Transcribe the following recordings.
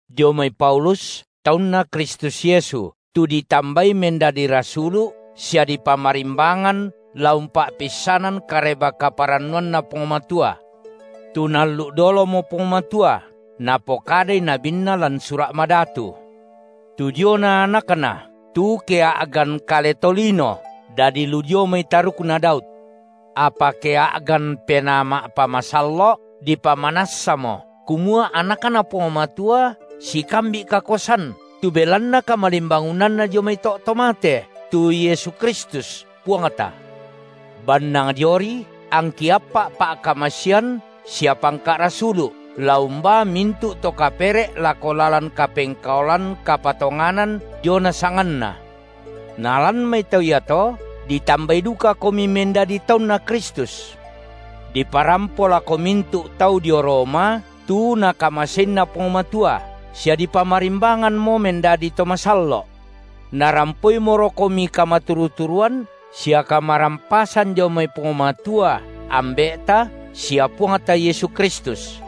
Dio mai Paulus taunNa Kristus Yesu, tu ditambai mendadi rasulu’ sia dipamarimbangan la umpa’peisanan Kareba-kaparannuanNa Puang Matua. Tu Naallu’ dolomo Puang Matua, napokadai nabinNa lan Sura’ Madatu, tu diona AnakNa, tu kea’gan kale tolino, dadi lu dio mai tarukna Daud, apa kea’gan Penaa ma’pamasallo’, dipamanassamo kumua AnakNa Puang Matua sikambi’ kakuasan, tu belanna kamalimbangunanNa dio mai to’ to mate, tu Yesu Kristus, Puangta. Bannang diori angki appa’ pa’kamasean sia pangka’ rasulu’ la umbaa mintu’ to kapere’ lako lalan kapengkaolan kapatonganan diona sanganNa. Nalan mai tau iato ditambai dukakomi mendadi taunNa Kristus. – Diparampo lako mintu’ tau dio Roma tu Nakamaseinna Puang Matua sia dipamarimbanganmo mendadi to masallo’. Narampoimorokomi kamaturu-turuan sia kamarampasan dio mai Puang Matua Ambe’ta sia Puangta Yesu Kristus.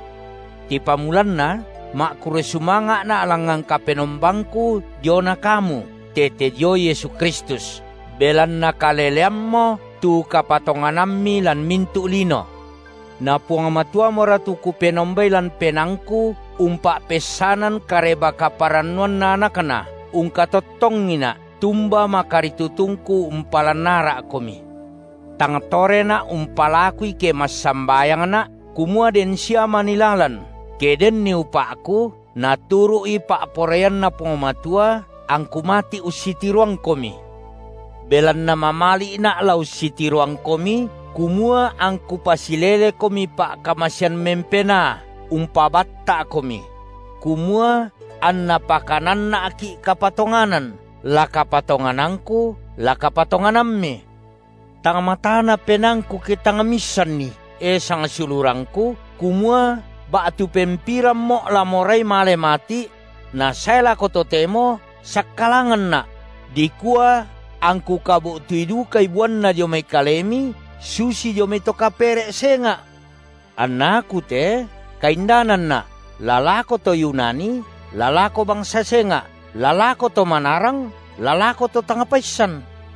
Tipamulanna ma’kurre sumanga’na’ langngan Kapenombangku diona kamu tete dio Yesu Kristus, belanna kaleleammo tu kapatonganammi lan mintu’ lino. Na Puang Matuamora tu Kupenombai lan penaangku umpa’peissanan Kareba-kaparannuanNa AnakNa, ungkatottongina’, tumba makaritutungku umpalan ara’komi, tang torena’ umpalakui ke massambayangna’, kumua den sia manii lalan, ke denni upa’ku, naturu’i pa’poraianNa Puang Matua angku mati’ ussitiroangkomi. Belanna mamali’na’ la ussitiroangkomi, kumua angku pasilelekomi pa’kamasean mempenaa umpabatta’komi; kumua anna pakananna’ki’ kapatonganan, la kapatonganangku la kapatonganammi. Tang matana penaangku ke tang miissanni, e sangsiulurangku, kumua ba’tu pempirammo’ la morai male mati’ – nasae lako totemo sakkalanganna’, – dikua angku kabu’tui dukai buanna dio mai kalemi susi dio mai to kapere’ senga’. Anna aku te kaindananna’, la lako to Yunani la lako bangsa senga’, la lako to manarang, la lako to tang paissan.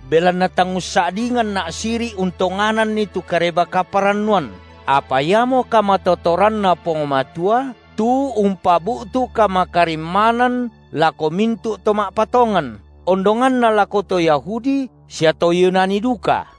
Belanna tang ussa’dinganna’ siri’ untongananni tu Kareba-kaparannuan, apa iamo kamatotoranNa Puang Matua tu umpabu’tu kamakarimmanan lako mintu’ to ma’patongan, ondonganna lako to Yahudi sia to Yunani duka.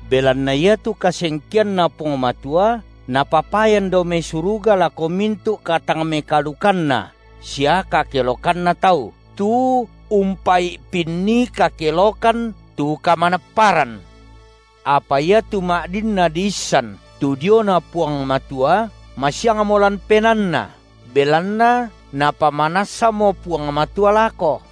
Belanna iatu kasengkeanNa Puang Matua Napapayan dao mai suruga lako mintu’ katangmekaalukanna sia kakelokanna tau, tu umpai’pinni kakelokan tu kamanapparan; apa iatu ma’dinna diissan tu diona Puang Matua masiangmo lan penaanna, belanna Napamanassamo Puang Matua lako.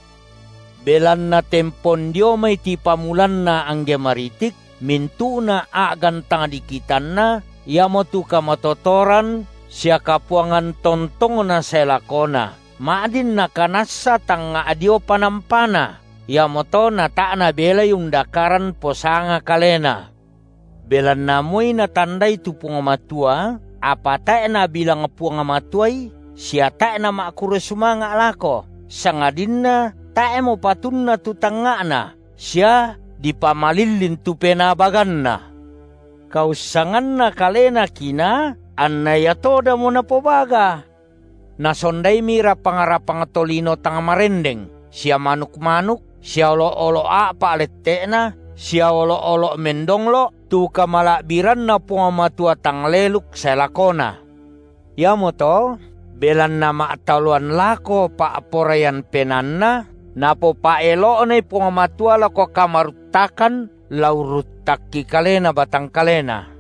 Belanna tempon dio mai tipamulanna angge maritik, mintu’na a’gan tang dikitanNa, iamotu kamatotoran sia Kapuangan tontongNa sae lakona, ma’din nakanassa tangnga’ dio panampaNa; iamoto natae’ nabelai undakaran posanga kalena, belanna moi natandai tu Puang Matua, apa tae’ nabilang Puang Matuai sia tae’ nama’kurre sumanga’ lako, sangadinna tae’mo patunna tu tangnga’na sia dipamalillin tu penaa baganna. Kaussanganna kalena kinaa anna ia todamo napobaga, nasondaimi rapang-rapang tolino tang marendeng sia manuk-manuk sia olo’-olo’ a’pa’ lette’na sia olo’-olo’ mendonglo’ tu kamala’biranNa Puang Matua tang leluk sae lakona. Iamoto belanna ma’taloan lako pa’poraian penaanna, Napopa’elo’nai Puang Matua lako kamaruttakan la urruttakki kalena batang kalena;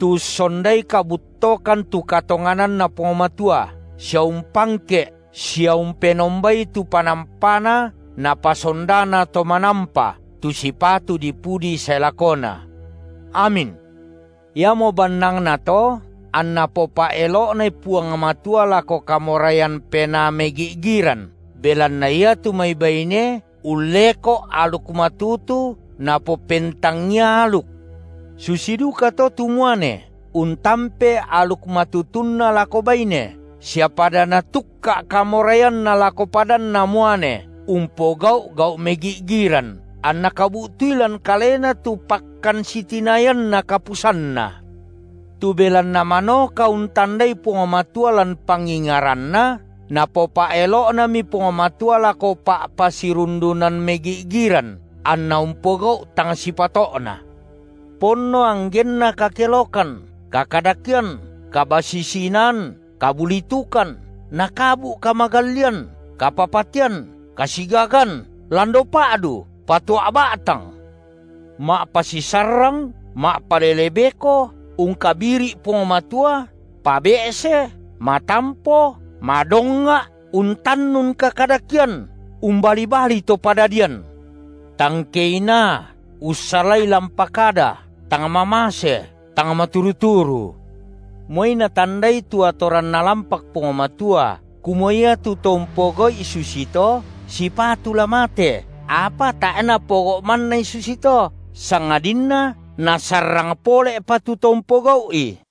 tu ussondai kabuttokan tu katongananNa Puang Matua sia umpangke’ sia umpenombai tu panampaNa napasondana To manampa, tu sipatu dipudi sae lakona. Amin. Iamo bannangnato anNa popa’elo’nai Puang Matua lako kamoraian penaa megi’giran, belanna iatu mai baine ulleko’ aluk matutu napopentangia aluk; susi dukato tu muane untampe aluk matutunna lako baine sia pada natukka’ kamoraianna lako padanna muane umpogau’ gau’ megi’giran, anna kabu’tui lan kalena tu pakkan sitinayanna kapusanna. Tu belanna manoka untandai Puang Matua lan pangingaranna Napopa’elo’nami Puang Matua lako pa’pasirundunan megi’giran anna umpogau’ tang sipato’na; ponno anggenna kakelokan, kakadakean, kabasisi-inaan, kabulitukan, nakabu’ kamagallian, kapapatean, kasigagan, lando pa’du, patua’ ba’tang; ma’pasisarrang, ma’palele beko, ungkabiri’ Puang Matua, pabe’se, matampo, madongnga’ untannun kakadakean, umbali-bali to padadian; tang keinaa, ussalai lampa kada, tang mamase, tang maturu-turu. Moi natandai tu atoran Nalampak Puang Matua, kumua iatu to umpogau’i susito sipatu la mate, apa tae’ napogau’ mannai susito, sangadinna nasarrang pole’pa tu to umpogau’i.